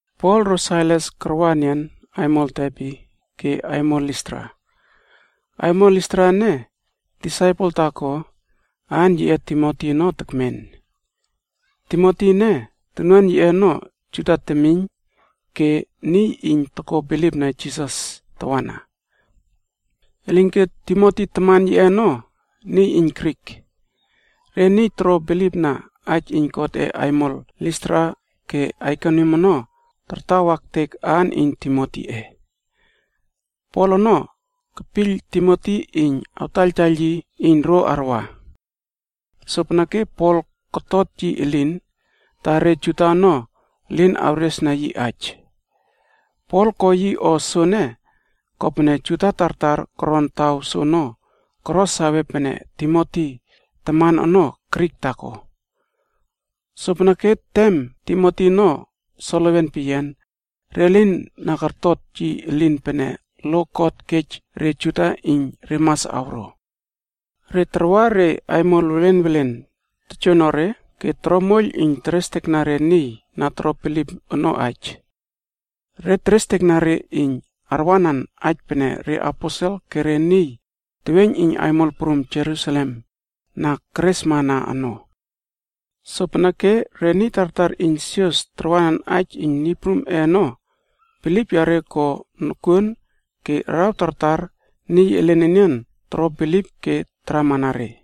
Pol ro Sailas karwa enian aimol Derbe ke aimol Listra. Aimol Listra ene, disaipel taako aan yiꞌe Timoti ono tekmen. Timoti ene, tonuan yiꞌe ono Juda temiyn ke niy iyn toko bilipna Jisas tawana. Elinke Timoti taman yiꞌe ono niy iyn Grik. Re niy toro bilipna aij iyn Godꞌe aimol Listra ke Aikonium ono tartawa ektek aan iyn Timotiꞌe. Pol ono kepiyl Timoti iyn awtaiyltaiyl yi iyn ro arwa. Sopeneke Pol kotot yi elin, ta re Juda ono elin awresna yi aij. Pol ko yi o soene kopene Juda tartar koron taw soono koro sawe pene Timoti taman ono Grik taako. Sopeneke tem Timoti ono solewen peyian, re lin na kortota yi elin pene lo God kej re Juda iyn re mas awro. Re tarwa re aimol welen welen tojoonore ke toro moiyl iyn terestekna re niy na toro bilip ono aij. Re terestekna re iyn arwanan aij pene reaposel ke re niy teweiyn iyn aimol prum Jerusalem na keresmana ono. Sopeneke re niy tartar iyn sios tarwanan aij iyn Niy Prumꞌe ono bilip yare ko nokuon ke araw tartar niy elen enian toro bilip ke taramana re.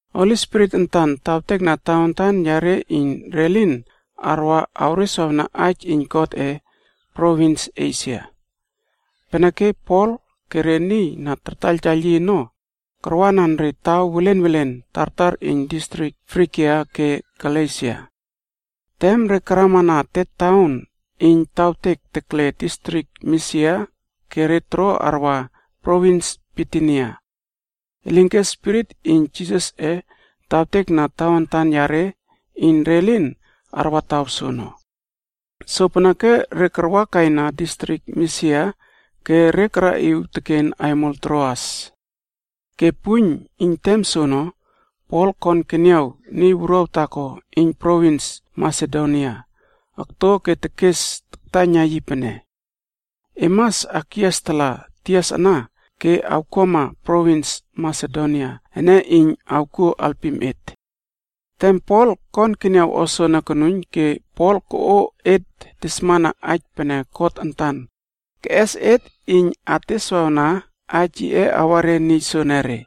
Holi Spirit antan tawtekna tawantan yare iyn re lin arwa awreswawna aij iyn Godꞌe provins Esia. Peneke Pol ke re niy na tartaiyltaiyl yi ono karwanan re taw welen welen tartar iyn distrik Frigia ke Galesia. Tem re karamana te taon iyn taktawtek tekle distrik Misia ke re toro arwa provins Bitinia, elinke Spirit iyn Jisasꞌe tawtekna tawantan yare iyn re lin arwa taw soono. Sopeneke re karwakaina distrik Misia ke re karaꞌiw teken aimol Troas. Ke puiyn iyn tem soono, Pol kon keniaw niy wuruaw taako iyn provins Masedonia okto ke tekes taktaiyna yi pene, “E mas akyias tala tias ana ke awkuama provins Masedonia ene iyn awkuo alpim et.” Tem Pol kon keniaw o soene konuiyn ke Pol koꞌo etb tesmana aij pene God antan keꞌes et iyn et ateswawna aij yiꞌe awa re niy soenere.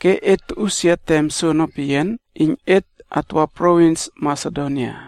Ke et toꞌusia tem soono peyian iyn et atwa provins Masedonia.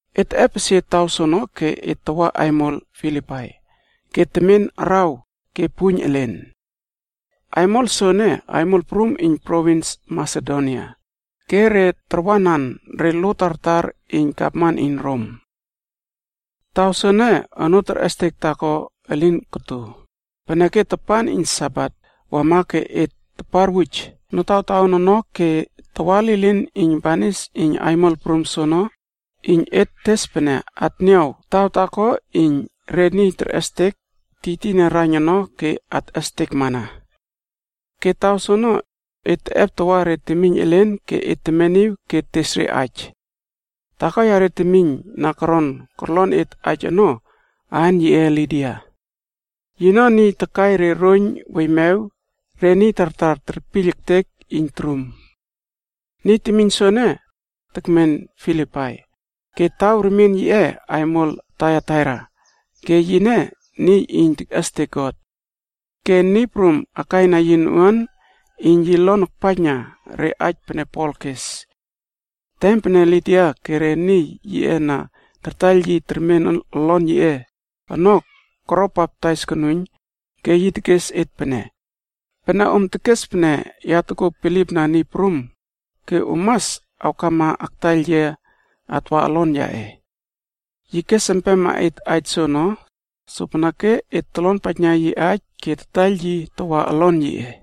Et teꞌepesie taw soono ke et tawa aimol Filipai ke temen araw ke puiyn elen. Aimol soene aimol prum iyn provins Masedonia, ke re tarwanan re lo tartar iyn gavman iyn Rom. Taw soene onoo terꞌestek taako elin koto, peneke tapan iyn Sabat wama ke et taparwuj notawtaon ono ke tawa lilin iyn banis iyn aimol prum soono iyn et tes pene atniaw taw taako iyn re niy terꞌestek tiytiyna raiyn ono ke atꞌestekmana. Ke taw soono, et teꞌep tawa re temiyn elen ke et temeniw ke tes re aij. Taako yare temiyn na koron korlon et aij ono, aan yiꞌe Lidia. Yino niy takai re roiyn weiymew re niy tartar terpiyl ektek iyn torum. Niy temiyn soene, tekmen Filipai ke taw remien yiꞌe, aimol Taiataira ke yine niy iyn tekꞌestek God. Ke Niy Prum akaina yi noꞌuan iyn yi lon akpaijna re aij pene Pol kes. Tem pene Lidia ke re niy yiꞌe na tartaiyl yi termen olon yiꞌe ono koro baptais konuiyn, ke yi tekes et pene, “Pene om tekes pene ya tokuo bilipna Niy Prum, ke om mas awkama aktaiyl yia atwa olon yaꞌe.” Yi kes empema et aij soono, sopeneke et tolonpaijna yi aij ke tataiyl yi tawa olon yiꞌe.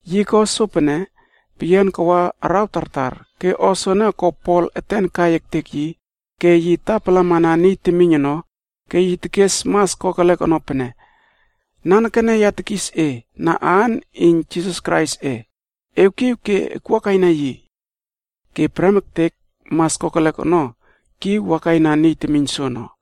Yi ko sopene peyian kawa araw tartar, ke o soene ko Pol eten kai ektek yi ke yi tapalamana niy temiyn ono, ke yi tekes mas kokelek ono pene, “Nanekene ya tekis e na aan iyn Jisas Kraisꞌe, ewkiw ke akwuakaina yi.” Ke prem ektek mas kokelek ono kiw wakaina niy temiyn soono.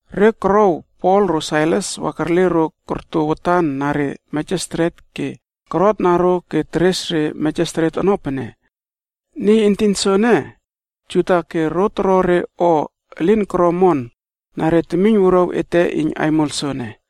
Re korouw Pol ro Sailas wa kerle ro korto watan na re Mejistret ke korotna ro ke teres re Mejistret ono pene, “Niy entin soene, Juda ke ro toro re o elin koro omon na re temiyn wuruaw ete iyn aimol soene.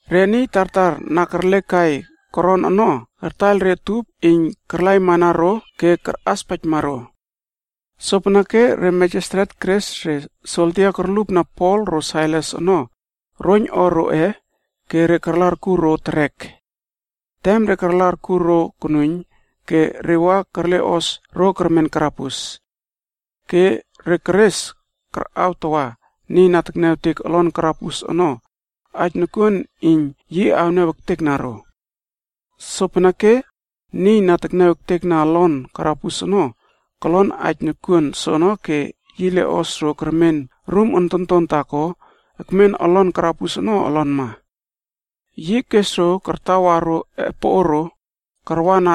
Re niy tartar na kerlekai koron ono kartaiyl re utup iyn karlamana ro ke karꞌaspaijma ro. Sopeneke re Mejistret keres re soldia korlupna Pol ro Sailas ono roiyn o roꞌe ke re karla arkur ro terek. Tem re karla arkur ro konuiyn, ke re wa kerleꞌos ro kermen karabus. Ke re keres karꞌaw tawa niy na tekniawtek olon karabus ono aij nokuon iyn yi awniaw ektekna ro. Sopeneke niy na tekniawtek olon karabus ono kolon aij nokuon soono ke yi leꞌos ro kermen rum ontonton taako ekmen olon karabus ono olonma. Yi kes ro kartawar ro epoꞌoro karwana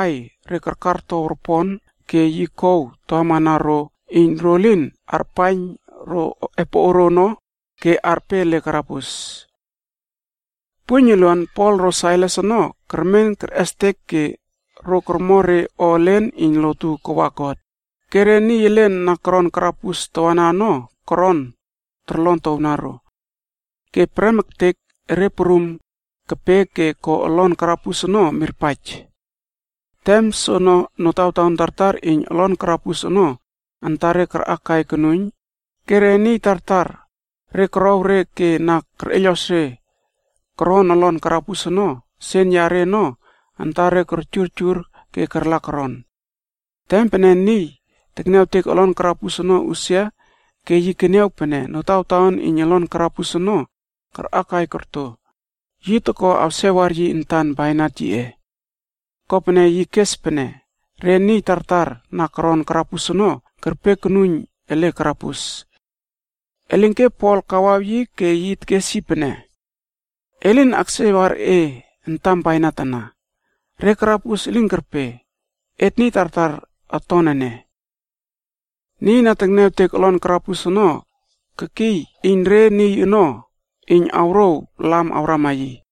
aiy re karkartow ropon ke yi kow tawaꞌiwna ro iyn ro lin arpaiyn ro epoꞌoro ono ke arpe ele karabus. Puiyn uluan Pol ro Sailas ono kermen kerꞌestek ke ro kormo re o elen iyn lotu kawa God, ke re karabus elen ono tawana koron torlon towna ro. Ke prem ektek erre prum kepe ke ko olon karabus ono mirpaij. Tem soono notawtaon tartar iyn olon karabus ono antare karꞌakai konuiyn ke re niy tartar re korow re ke na kerꞌeiylꞌos re koron olon karabus ono sen yare ono antare korjurjur ke karla koron. Tem pene niy na tekniawtek olon karabus ono usia ke yi keniaw pene notawtaon iyn olon karabus ono karꞌakai korto, yi toko awsewar yi antan bainat yiꞌe. Kopene yi kes pene re niy na koron karabus ono kerpe konuiyn ele olon karabus ono. Elinke Pol kawaw yi ke yi tekes yi pene, “E lin aksewar e antam bainat ana, re karabus elin kerpe, et niy tartar oton ene.” Niy na tekniawtek olon karabus ono kekiy iyn re niy ono iyn awrouw lam awrama yi.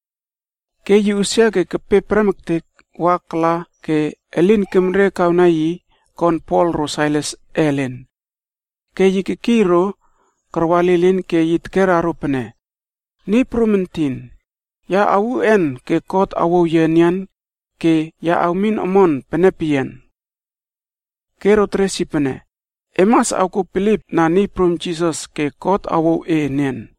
Ke yi usia ke kepe prem ektek wa kala ke elin kemrekawna yi kon Pol ro Sailas ellen. Ke yi kekiy ro karwa lilin ke yi tekera ro pene, “Niy prum entin, ya awuꞌen ke God awouw yia enian ke ya awmin omon pene peyian?” Ke ro teres yi pene, “E mas awkuo bilipna Niy prum Jisas ke God awouw e enian.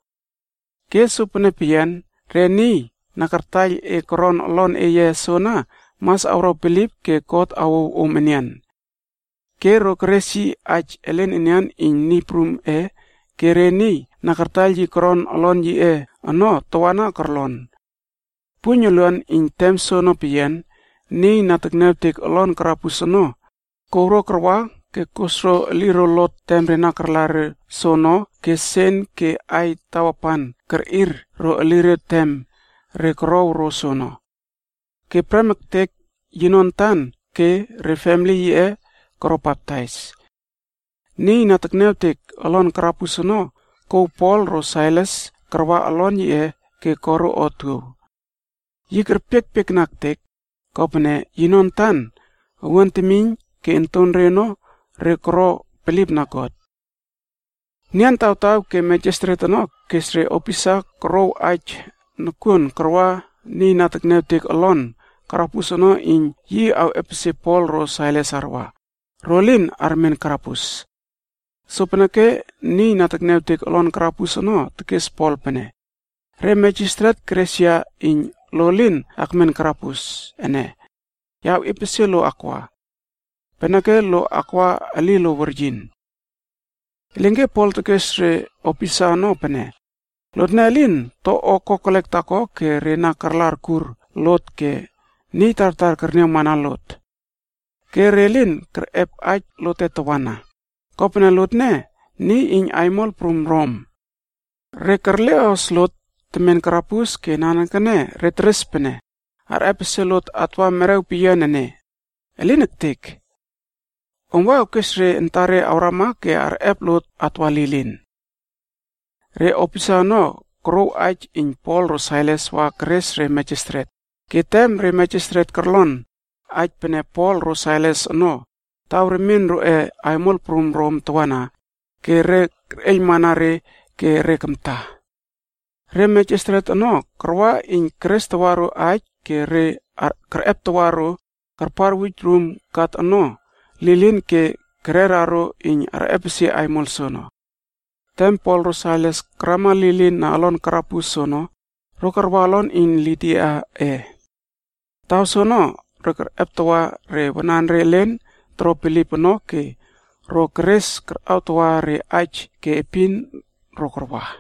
Ke sopene peyian re niy na kartaiyl e koron olon eye soana mas awro bilip ke God awouw om enian.” Ke ro keres yi aij elen enian iyn Niy Prumꞌe ke re niy na kartaiyl yi koron olon yiꞌe ono tawana korlon. Puiyn uluan iyn tem soono peyian niy na tekniawtek olon karabus ono, kouw ro karwa ke kos ro eliro lot tem re na karla ro soono ke sen ke aiy tawapan kerꞌir ro eliro tem re korow ro soono. Ke prem ektek yino antan ke re famili yiꞌe koro baptais. Niy na tekniawtek olon karabus ono kouw Pol ro Sailas karwa olon yiꞌe ke ko ro otuow. Yi kerpiekpiekna ektek, kopene yino antan, owuan temiyn ke ontonre ono re koro bilipna God. Nian tawtaw ke mejistret ono kes re opisa korouw aij nokuon karwa niy na tekniawtek olon karabus ono iyn yi awꞌepesie Pol ro Sailas arwa, ro lin armen karabus. Sopeneke niy na tekniawtek olon karabus ono tekes Pol pene, “Re mejistret keres yia iyn lo elin akmen karabus ene, ya awꞌiepesie lo akwa. Peneke lo akwa elilo weryin.” Elinke Pol tekes re opisa ono pene, “Lotne elin to o kokelek taako ke re na karla akur lot ke niy tartar kerniawmana lot. Ke re lin kerꞌep aij lote tawana, kopene lotne niy iyn aimol prum Rom. Re kerleꞌos lot temen karabus ke nanekene re teres pene arꞌepesie lot atwa merew peyian ene? Elin ektek! Om wa awkes re antare awrama ke arꞌep lot atwa lilin.” Re opisa ono korouw aij iyn Pol ro Sailas wa keres re mejestret, ke tem re mejestret korlon aij pene Pol ro Sailas ono taw remien roꞌe aimol prum Rom tawana ke re kerꞌeiylmana re ke re kamta. Re mejestret ono karwa iyn kerestawa ro aij ke kerꞌeptawa ro karpar karawuj rum kat ono lilin ke keres empema ro iyn arꞌepesie aimol soono. Tem Pol ro Sailas karama lilin na olon karabus soono, ro karwa olon iyn Lidiaꞌe. Taw soono ro kerꞌeptawa re wanare elen toro bilip ono ke ro keres karꞌawtawa re aij ke epin ro karwa.